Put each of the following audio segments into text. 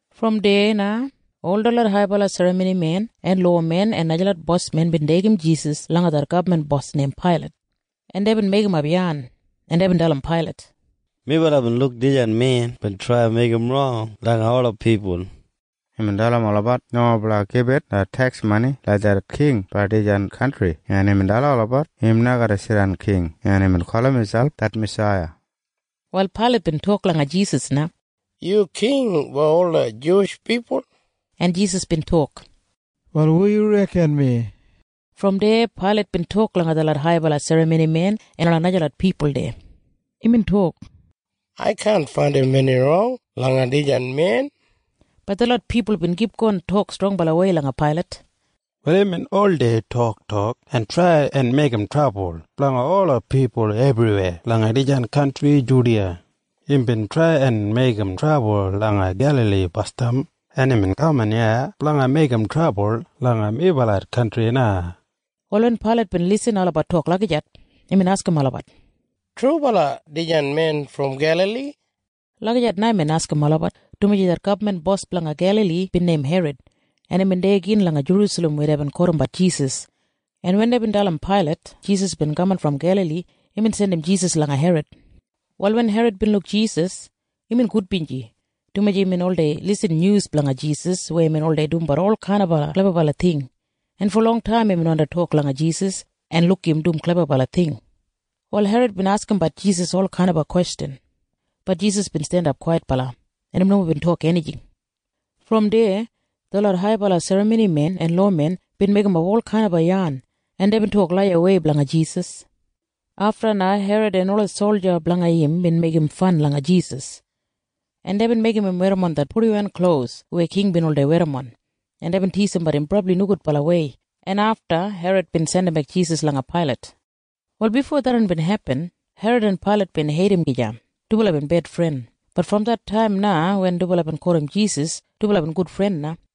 Brom deya na ol detlot haibala serramonimen en lowamen en najalot bosmen bin deigim Jisas langa det gabman bos neim Pailat, en deibin meigimap yan, en deibin dalim Pailat, “Melabat bin luk dijan men bin trai en meigim rong langa ola pipul. Imbin dalim olabat nomo blanga gibit det teks mani langa det king blanga dijan kantri, en imbin dalim olabat im na garra jidan king, en imbin gulum miselp det Masaiya.” Wal Pailat bin tok langa Jisas na, “Yu king blanga ol dislot Juwish pipul?” En Jisas bin tok, “Wal hu yu reken mi?” Brom deya Pailat bin tok langa detlot haibala serramonimen en ola najalot pipul deya. Imbin tok, “Ai kaan faindim eni rong langa dijan men.” Bat detlot pipul bin kipgon tok strongbalawei langa Pailat, “Wal imbin oldei toktok en trai en meigim trabul blanga ola pipul ebriweya langa dijan kantri Judiya. Imbin trai en meigim trabul langa Gelali basdam, en imbin kaman iya blanga meigim trabul langa melabat kantri na.” Wal wen Pailat bin irrim olabat tok lagijat, imbin askim olabat, “Trubala dijan men brom Gelali?” Lagijat na imbin askim olabat, dumaji det gabman bos blanga Gelali bin neim Herod, en imbin deya gin langa Jerusalem weya deibin kotimbat Jisas. En wen deibin dalim Pailat Jisas bin kaman brom Gelali, imbin jandim Jisas langa Herod. Wal wen Herod bin luk Jisas, imbin gudbinji, dumaji imbin oldei irrim nyus blanga Jisas weya imbin oldei dumbat olkainaba klebabala ting, en fo longtaim imbin wandi tok langa Jisas en luk im dum klebabala ting. Wal Herod bin askimbat Jisas olkainaba kwestjan. Bat Jisas bin jandap kwaitbala, en im nomo bin tok enijing. Brom deya detlot haibala serramonimen en lowamen bin meigimap olkainaba yan, en deibin tok laiyawei blanga Jisas. Afta na Herod en ola solja blanga im bin meigim fan langa Jisas, en deibin meigim im werrimon det purdiwan klos weya king bin oldei werrimon, en deibin tisimbat im brabli nogudbalawei, en afta Herod bin jandimbek Jisas langa Pailat. Wal bifo tharran bin hepin, Herod en Pailat bin heidim gija. Dubala bin bedfren. Bat brom det taim na wen dubala bin kotim Jisas, dubala bin gudfren na.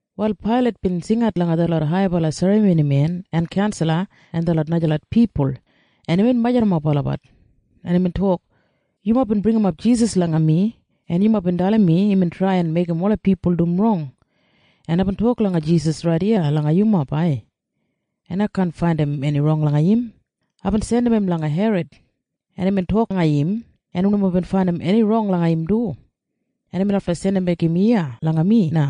Wal Pailat bin jingat langa detlot haibala serramonimen en kaunsala en detlot najalot pipul, en imbin majurrumap olabat, en imbin tok, “Yumob bin bringimap Jisas langa mi, en yumob bin dalim mi imbin trai en meigim ola pipul dum rong. En aibin tok langa Jisas rait iya langa yumob ai, en ai kaan faindim eni rong langa im. Aibin jandim im langa Herod, en imbin tok langa im, en im nomo bin faindim eni rong langa im du, en imbin lafta jandimbek im langa mi na.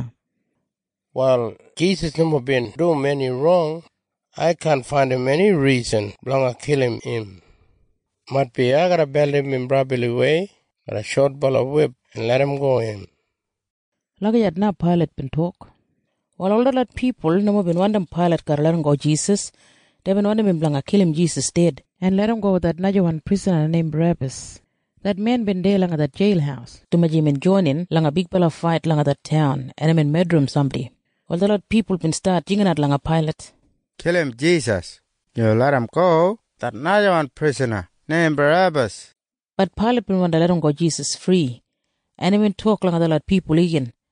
“Wal Jisas nomo bin dum eni rong. Ai kaan faindim eni risan blanga kilim im. Maitbi ai garra beldim im brabliwei garram shotbala wip en larramgo im.” Lagijat na Pailat bin tok. Wal ol detlot pipul nomo bin wandim Pailat garra larramgo Jisas. Deibin wandim im blanga kilim Jisas ded en larramgo det najawan prisana neim Barebas. Det men bin deya langa det jeil dumaji imbin joinin langa bigbala fait langa det taun en imbin medrim sambodi. Wal detlot pipul bin stat jinginat langa Pailat, “Kilim Jisas! Yu larramgo det najawan prisana neim Barebas!” Bat Pailat bin wandi larramgo Jisas fri, en imbin tok langa detlot pipul igin.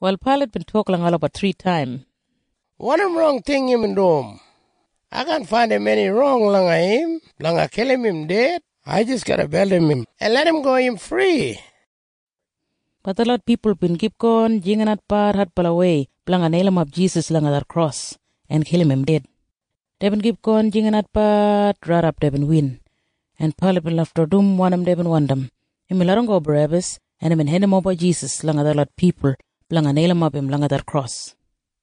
Wal Pailat bin tok langa olabat thritaim, “Wanim rong ting imbin dum? Ai kaan faindim eni rong langa im blanga kilim im ded. Ai garra jis beldim im en larramgo im fri.” Bat detlot pipul bin kipgon jinginatbat adbalawei blanga neilimap Jisas langa det kros en kilim im ded. Deibin kipgon jinginatbat raidap deibin win, en Pailat bin lafta dum wanim deibin wandim. Imbin larramgo Barebas, en imbin hendimoba Jisas langa detlot pipul blanga neilimap im langa det kros.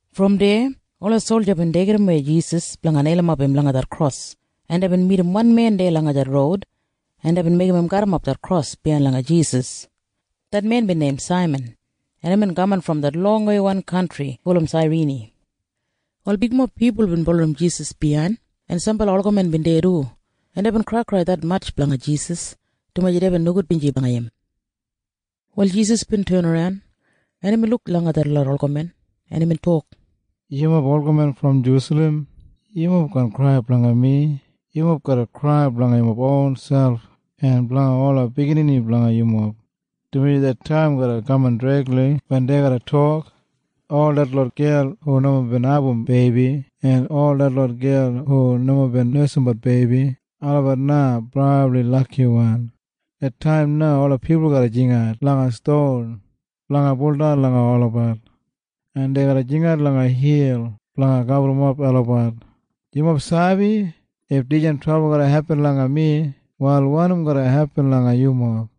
Brom deya ola solja bin deigimwei Jisas blanga neilimap im langa det kros, en deibin midim wan men deya langa det roud, en deibin meigim im garrimap det kros biyain langa Jisas. Det men bin neim Saiman, en imbin kaman brom det longweiwan kantri gulum Sairini. Wal bigmob pipul bin bulurrum Jisas biyain, en sambala olgamen bin deya du, en deibin kraikrai detmatj blanga Jisas, dumaji deibin nogudbinji blanga im. Wal Jisas bin tenaran, en imbin luk langa detlot olgamen, en imbin tok, “Yumob olgamen brom Jerusalem, yumob kaan krai blanga mi. Yumob garra krai blanga yumob ronselp en blanga ola biginini blanga yumob, dumaji det taim garra kaman dregli wen dei garra tok, ‘Ol detlot gel hu nomo bin abum beibi en ol detlot gel hu nomo nesimbat beibi, olabat na brabli lakiwan.’ Det taim na ola pipul garra jingat langa ston blanga buldan langa olabat, en dei garra jingat langa hil blanga gaburrumap olabat. “Yumob sabi? If dijan trabul garra hepin langa mi, wal wanim garra hepin langa yumob?”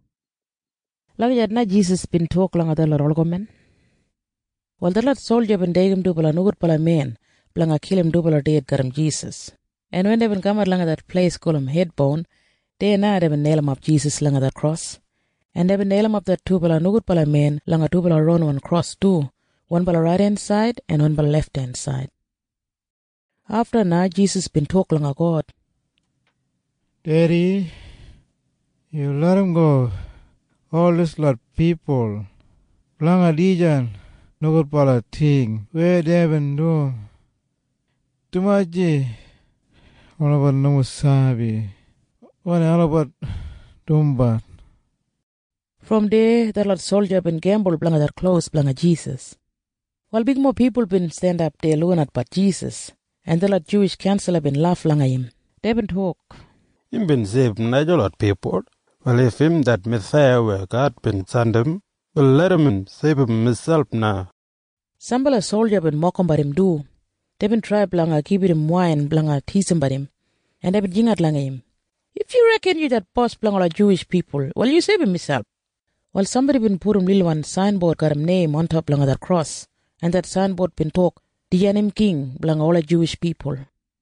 Lagijat na Jisas bin tok langa detlot olgamen. Wal detlot solja bin deigim dubala nogudbala men blanga kilim dubala ded garram Jisas, en wen deibin kamat langa det pleis gulum “Hed Boun”, deya na deibin neilimap Jisas langa det kros, en deibin neilimap det dubala nogudbala men langa dubala ronwan kros du, wanbala raidensaid en wanbala lefthensaid. Afta na Jisas bin tok langa God, “Dedi, yu larramgo ol dislot pipul blanga dijan nogudbala ting weya deibin dum, dumaji olabat nomo sabi wanim olabat dumbat.” Brom deya detlot solja bin gembul blanga det klos blanga Jisas. Wal bigmob pipul bin jandap deya lukinatbat Jisas, en detlot Juwish kaunsala bin laf langa im. Deibin tok, “Imbin seibum najalot pipul. Wal if im det Masaiya weya God bin jandim, wal larram im seibum imselp na!” Sambala solja bin mokimbat im du. Deibin trai blanga gibit im wain blanga tisimbat im, en deibin jingat langa im, “If yu reken yu det bos blanga ola Juwish pipul, wal yu seibum miselp!” Wal sambodi bin pudum lilwan sainbod garram neim ontop langa det kros, en det sainbod bin tok, “Dijan im king blanga ola Juwish pipul.”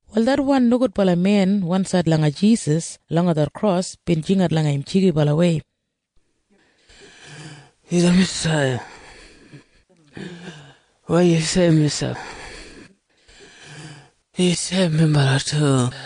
Wal det wan nogudbala men wansaid langa Jisas langa det kros bin jingat langa im jigibalawei, “Yu det Masaiya? Wal yu seibum miselp, en yu seibum minbala du!”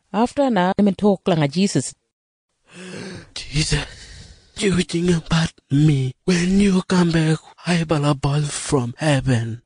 Afta na imbin tok langa Jisas, “Jisas, yu jinggabat mi wen yu kambek haibala bos brom hebin.”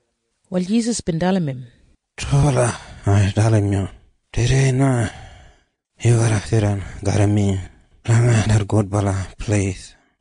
Wal Jisas bin dalim im, “Trubala ai dalim yu. Tudei na yu garra jidan garram mi langa det gudbala pleis.”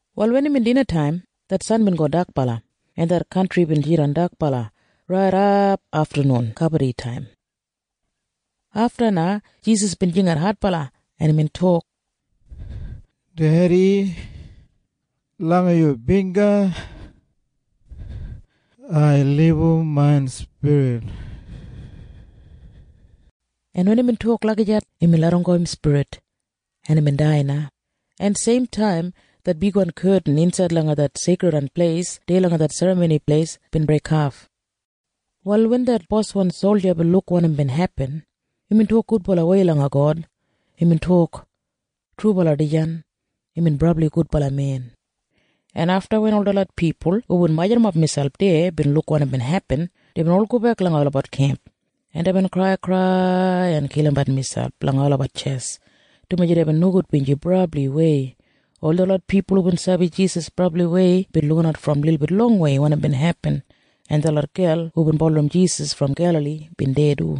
Wal wen imbin dinataim, det san bin go dakbala, en det kantri bin jidan dakbala raidap aftanun kabaditaim. Afta na Jisas bin jingat adbala, en imbin tok, “Dedi, langa yu bingga ai libum main spirit!” En wen imbin tok lagijat, imbin larramgo im spirit, en imbin dai na, en seimtaim det bigwan ketin insaid langa det Seikridwan Pleis deya langa det Serramoni Pleis bin breikhaf. Wal wen det boswan solja bin luk wanim bin hepin, imbin tok gudbalawei langa God. Imbin tok, “Trubala dijan imbin brabli gudbala men!” En afta wen ol detlot pipul hubin majurrumap miselp deya bin luk wanim bin hepin, deibin ol gobek langa olabat kemp, en deibin kraikrai en kilimbat miselp langa olabat tjes, dumaji deibin nogudbinji brabliwei. Ol detlot pipul hubin sabi Jisas brabliwei bin lukinat brom lilbit longwei wanim bin hepin, en detlot gel hubin bulurrum Jisas brom Gelali bin deya du.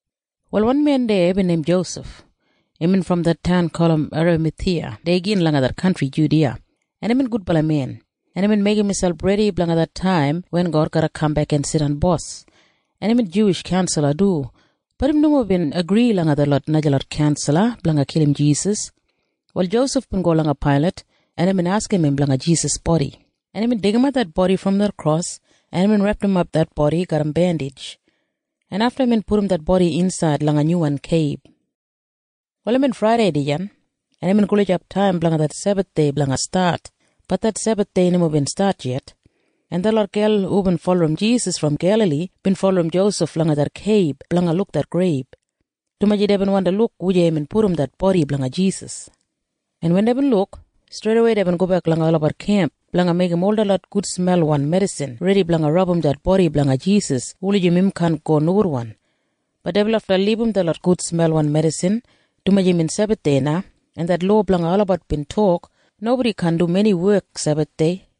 Wal wan men deya bin neim Josef. Imbin brom det taun gulum Eramathiya deya gin langa det kantri Judiya. En imbin gudbala men, en imbin meigim miselp redi blanga det taim wen God garra kambek en jidan bos. En imbin Juwish kaunsala du. Bat im nomo bin agri langa detlot najalot kaunsala blanga kilim Jisas. Wal Josef bin go langa Pailat, en imbin askim im blanga Jisas bodi, en imbin deigimat det bodi brom det kros en imbin repdimap det bodi garram bendij, en afta imbin pudum det bodi insaid langa nyuwan keib. Wal imbin Fraidei dijan, en imbin gulijap taim blanga det Sebathdei blanga stat. Bat det Sebathdei nomo bin stat yet, en detlot gel hubin bulurrum Jisas brom Gelali bin bulurrum Josef langa det keib blanga luk det greib, dumaji deibin wandi luk wujei imbin pudum det bodi blanga Jisas, en wen deibin luk, streidawei deibin gobek langa olabat kemp blanga meigim ol detlot gudsmelwan medisin redi blanga rabum det bodi blanga Jisas wulijim im kaan go nogudwan. Bat deibin lafta libum detlot gudsmelwan medisin, dumaji imbin Sebathdei na, en det lowa blanga olabat bin tok nobodi kaan dum eni wek Sebathdei.